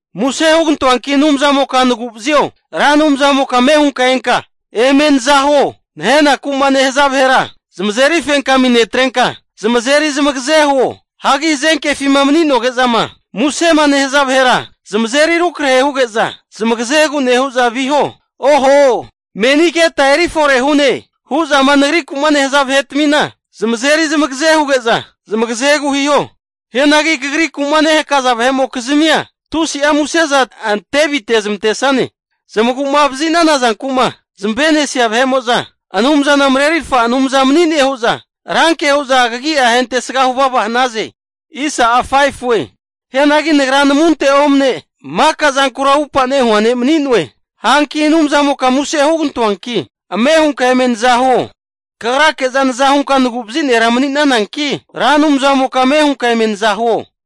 Muse hugantoanki Anumzamoka nagu'vazio! Ra Anumzamoka ame hunka enka eme nazahuo. Nahenaku'ma nehaza vahera zamazeri fenkami netrenka, zamazeri zamagaze huo. Hagi hazenkefima mani'noge'zama musema nehaza vahera zamazeri rukrahe huge'za zamagazegu nehu'za viho. Oho! Meni keta eri fore hu'ne hu'zama nagriku'ma nehaza vahetmina, zamazeri zamagaze huge'za zamagazegu hiho. Hianagi Kagriku'ma nehakaza vahe'mokizmia, tusi'a muse'za ante avite'zmantesane. Zamagu'ma vazi'nana zanku'ma zamave'nesia vahe'mo'za Anumzana marerirfa Anumza mani'ne hu'za ranke hu'za kagia ahentesga huvava hanaze! Hianagi nagra namunte omne maka zankura upa nehua ne' mani'noe. Hanki Anumzamoka muse hugantoanki, ame hunka eme naza huo. Kagrake'za naza hunka naguvazi' nera mani'nananki, Ra Anumzamoka ame hunka eme nazahuo.